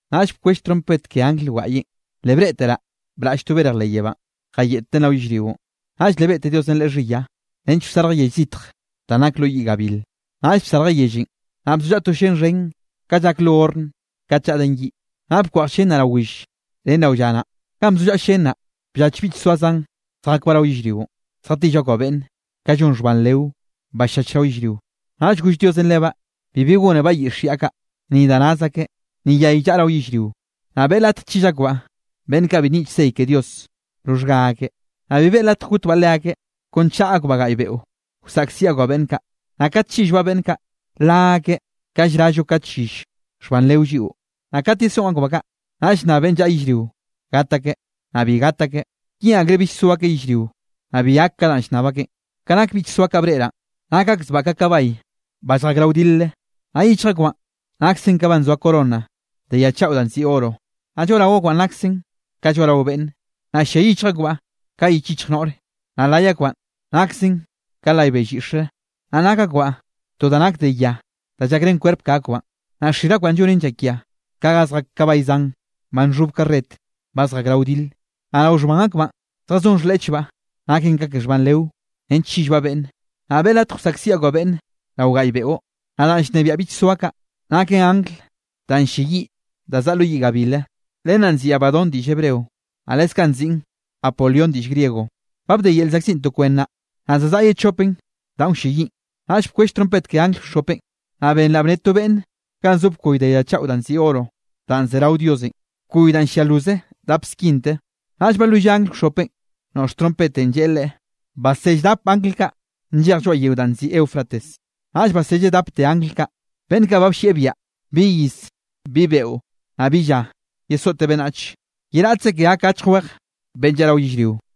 Naꞌll bkwell trompet ke angl wgaꞌyenꞌ, le breꞌteraꞌ braꞌll to berj leꞌ yebánꞌ, jayeꞌtten rao yellrionꞌ. Naꞌll le beꞌte Diosenꞌ len xhiya, nench wsarjen yell zitj danꞌ nak lo yiꞌ gabil. Naꞌll bsarjen yellenꞌ, naꞌ bzollaꞌa to llén xhen ka llak lo horn kat llaꞌden yiꞌ. Naꞌ bkweꞌj llén naꞌ rao will, ren rao lla naꞌ. Ganꞌ bzollaꞌa llén naꞌ, bllach bichsoa zan, zjakbaꞌ rao yellrionꞌ, zjatill akbaꞌ beꞌnne, ka llon xhban leo, ba ll-llach rao yellrio. Naꞌll goll Diosenꞌ lebaꞌ bibi gónebaꞌ yiꞌx yaꞌ kaꞌ, ni da naz akeꞌ, ni yay llaꞌa rao yellrio, naꞌ beꞌe latj chill akbaꞌ beꞌnn kaꞌ bi nyiꞌch sey ke Dios roxhga akeꞌ. Naꞌ bi beꞌe latje gotbaꞌ leakeꞌ, kon chaꞌa akbaꞌ gaꞌy beꞌo, wsaꞌkziꞌ akbaꞌ beꞌnn kaꞌ. Naꞌ kat chillbaꞌ beꞌnn kaꞌ, la akeꞌ ka llrallo kat yill xhban leo lliꞌo. Naꞌ kat yesoꞌn akbaꞌ kaꞌ, naꞌll nnab beꞌnn llaꞌa yellrio gat akeꞌ, naꞌ bi gat akeꞌ, yeꞌn akreꞌ bill so akeꞌ yellrio, naꞌ bi gak ka danꞌ llnnab akeꞌn. Ka nak bichsoa kaꞌ breꞌraꞌn, nak akzbaꞌ ka kabay ba lljak rao wdilre, naꞌ yichj akbaꞌn naksen ka ba nzoa corona de ya chaꞌo danꞌ nziꞌi oro, naꞌ lloaꞌrao akbaꞌn naksen ka lloaꞌrao beꞌnnre. Naꞌ llia yichj akbaꞌ ka yich yichj noꞌr, naꞌ lay akbaꞌn naksen ka lay bell yiꞌxre. Naꞌ nak akbaꞌ to da nak de ya da llakrén kwerp ke akbaꞌn, naꞌ xir akbaꞌn llonen llakia ka ga zjak kabay zan, ba nxhob karret ba zjak rao wdile. Naꞌ rao xhban akbaꞌn zjazón xhleꞌchbaꞌ, naken ka ke xhban leo nench chillbaꞌ beꞌnne, naꞌ beꞌe latj wsaꞌkziꞌ akbaꞌ beꞌnne rao gaꞌy beꞌo. Naꞌ danꞌ llnebiaꞌ bichsoa kaꞌ, naken angl danꞌ ll-lleyiꞌ da zaꞌa lo yiꞌ gabile, len naꞌ nziꞌn Abadón diꞌll Hebreo, naꞌ leskaꞌ nziꞌn Apolión diꞌll griego. Ba bde yel llzaꞌkziꞌn to kwen naꞌ, naꞌ za zaꞌa ye chopen danꞌ wlleyiꞌn. Naꞌll bkwell trompet ke angl wxhopenꞌ, naꞌ benraꞌ bnne to beꞌnne ganꞌ zo bkoy de ya chaꞌo danꞌ nziꞌi oro, danꞌ ze rao Diosenꞌ, bkoy da llia loze dap skinte. Naꞌll balwilleꞌ angl wxhopenꞌ noꞌx trompetenꞌ, lleꞌe leꞌe: —Basell dap angl kaꞌ nllej lloaꞌ yeo danꞌ nziꞌi Eufrates. Naꞌll baselle dapte angl kaꞌ, beꞌnn kaꞌ ba bllieꞌ biaꞌa, bi iz, bi beꞌo, naꞌ bi lla, yesoꞌte beꞌnnach, ye raꞌtze ke gak achj weje beꞌnn llaꞌa rao yellrio.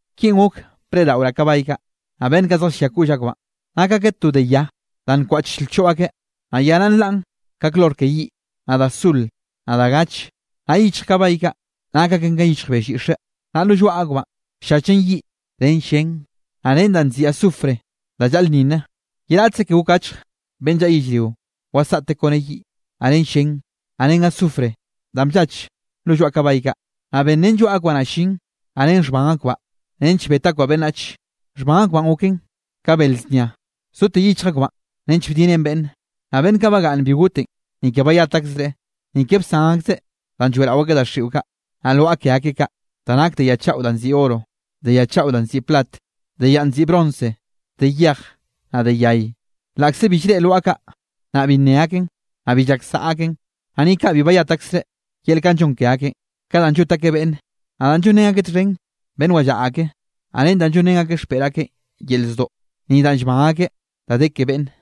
Kinꞌ gok breꞌdaꞌoraꞌ kabay kaꞌ, naꞌ beꞌnn kaꞌ zjallia koꞌll akbaꞌn, nak akeꞌ to de ya da nkwaꞌch lchoꞌ akeꞌ, naꞌ ya naꞌ nlaꞌn ka klor ke yiꞌ, naꞌ da sul, naꞌ da gache. Naꞌ yichj kabay kaꞌ, nak aken ka yichj bell yiꞌxe, naꞌ lo lloaꞌ akbaꞌn, ll-llachen yiꞌ ren llén, naꞌ ren danꞌ nziꞌi azufre da llaꞌlnninne. Ye raꞌtze ke gok achje beꞌnn llaꞌa yellrionꞌ wasaꞌte kone yiꞌ, naꞌ ren llén, naꞌ ren azufre danꞌ bllach lo lloaꞌ kabay kaꞌ. Naꞌ benrén lloaꞌ akbaꞌ naꞌ llin, naꞌ ren xhban akbaꞌ nench bet akbaꞌ beꞌnnach, xhban akbaꞌn goken ka bel znia, zote yichj akbaꞌ nench bdiꞌnnen beꞌnne. Naꞌ beꞌnn kaꞌ bagaꞌnn bi gotenꞌ, ni ke bayat akzreꞌ, ni ke bsan akzeꞌ danꞌ lloeꞌrao akeꞌ daxiꞌo kaꞌ, naꞌ lwaꞌa ke akeꞌ kaꞌ, da nake de ya chaꞌo danꞌ nziꞌi oro, de ya chaꞌo danꞌ nziꞌi plat, de yanꞌ nziꞌi bronce, de yej, naꞌ de yay, laꞌkze bi llreꞌe lwaꞌa kaꞌ, naꞌ bi nne aken, naꞌ bi llak saꞌa aken. Ni kaꞌ bi bayat akzreꞌ yel kanꞌ llon ke akeꞌn, ka danꞌ llot akeꞌ beꞌnne, naꞌ da llonrén akeꞌ txhen beꞌnn wallaꞌa ake, naꞌ ren da llonrén xpeꞌr akeꞌ yel zdoꞌ, ni danꞌ llban akeꞌ da de ke beꞌnne.